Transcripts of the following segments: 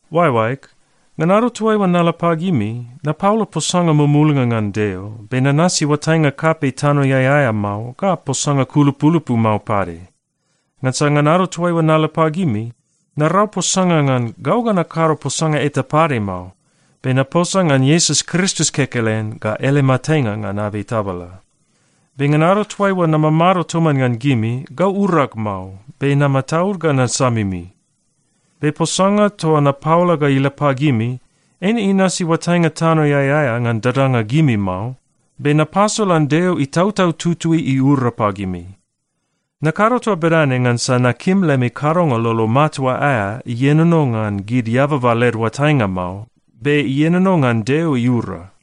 Oaeoaeg, ngan ado toaiua nala pagimi, napaola posanga mumulnga ngan Deo, be nanasi oatainga kapei tanoeai aea mao ga posanga kulupulupu mao pade. Ngansa ngan ado toaiua nala pagimi, narau posanga ngan gau ga nakado posanga eta pade mao, be naposa ngan Iesus Kristus kekelen ga ele matenga ngan abei tabala. Be ngan ado toaiua namamado toman ngan gimi, gau urag mao, be namataud ga nasamimi. Be posanga toa napaola ga ila pagimi, eine inasi oatainga tanoeai aea ngan dadanga gimi mao, be napasolan Deo Itautau Tutui iura pagimi. Nakado toa bedane ngansa nakim lemi kadonga lolo matua aea ienono ngan gid eababa led oatainga mao, be ienono ngan Deo iura.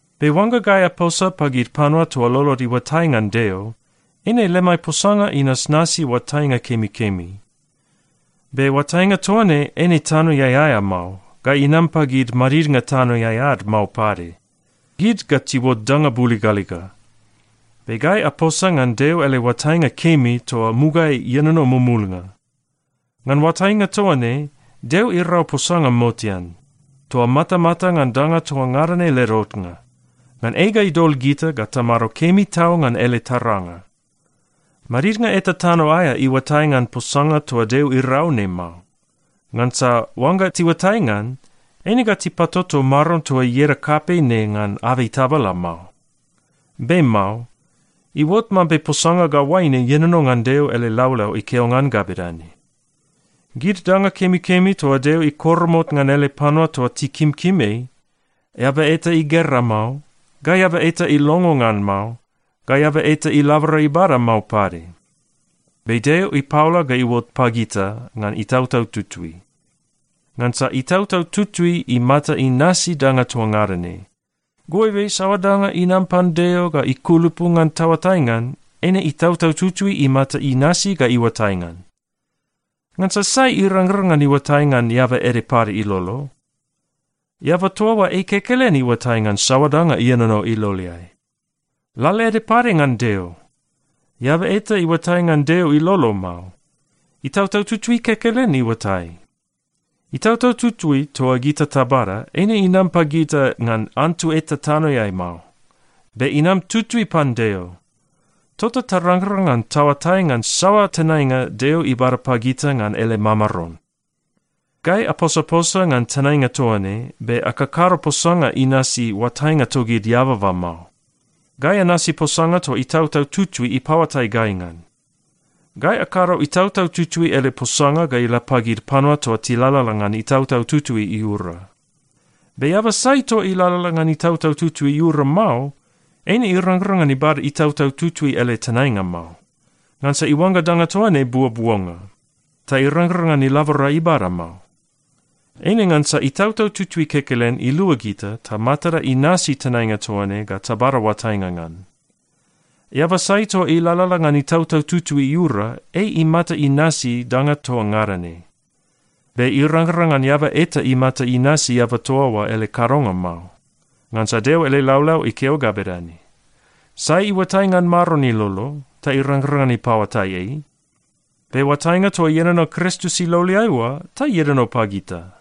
Be oangga gai aposa pagid panua toa lolod iuatai ngan Deo, eine lemai posanga inasnasi oatainga kemikemi. Be oatainga toa ne eine tanoeai aea mao ga inam pagid madidnga tanoeai ad mao pade. Gid ga tiuot danga buligaliga. Be gai aposa ngan Deo ele oatainga kemi toa mugaeai ienono mumulnga. Ngan oatainga toa ne, Deo irau posanga motean, toa matamata ngan danga toa ngada ne led otnga, ngan ei ga idol gita ga tamado kemi tau ngan ele taranga. Madidnga eta tano aea iuatai ngan posanga toa Deo irau ne mao. Ngansa oangga tiuatai ngan, eine ga tipatoto Maron toa ieda kapei ne ngan abei tabala mao. Be mao. Iuot mambe posanga ga oaine ienono ngan Deo ele laulau ikeo ngan ga bedane, “Gid danga kemikemi toa Deo ikoromot ngan ele panua toa tikimkim ei, eaba eta igera mao, ga eaba eta ilongo ngan mao, ga eaba eta ilabora ibada mao pade.” Be Deo ipaola ga iuot pagita ngan Itautau Tutui. Ngansa Itautau Tutui imata inasi danga toa ngada ne. Goibe saoa danga inam pan Deo ga ikulupu ngan taoatai ngan, eine Itautau Tutui imata inasi ga iuatai ngan. Ngansa sai irangrang ngan iuatai ngan eaba ede pade ilolo? Eaba toa oa ei kekelen iuatai ngan saoa danga ienono iloleai. Lalaede pade ngan Deo. Eaba eta iuatai ngan Deo ilolo mao. Itautau Tutui kekelen iuatai. Itautau Tutui toa gita tabada, eine inam pagita ngan antu eta tanoeai mao. Be inam tutui pan Deo. Tota tarangrang ngan taoatai ngan saoa tenainga Deo ibada pagita ngan ele mamaron. Gai aposaposa ngan tenainga toa ne, be akakado posanga inasi oatainga togid eababa mao. Gai anasi posanga toa Itautau Tutui ipaoatai gai ngan. Gai akado Itautau Tutui ele posanga ga ila pagid panua toa tilalala ngan Itautau Tutui iura. Be eaba sai toa ilalala ngan Itautau Tutui iura mao, eine irangrang ngan ibada Itautau Tutui ele tenainga mao, ngansa iuangga danga toa ne buobuonga, ta irangrang ngan ilabora ibada mao. Eine ngansa Itautau Tutui kekelen ilua gita ta matada inasi tenainga toa ne ga tabada oatainga ngan. Eaba sai toa ilalala ngan Itautau Tutui iura, ei imata inasi danga toa ngada ne. Be irangrang ngan eaba eta imata inasi eaba toa oa ele kadonga mao. Ngansa Deo ele laulau ikeo ga bedane, “Sai iuatai ngan Maron ilolo, ta irangrang ngan ipaoatai ei?” Be oatainga toa ienono Kristus iloleai oa ta ienono pagita.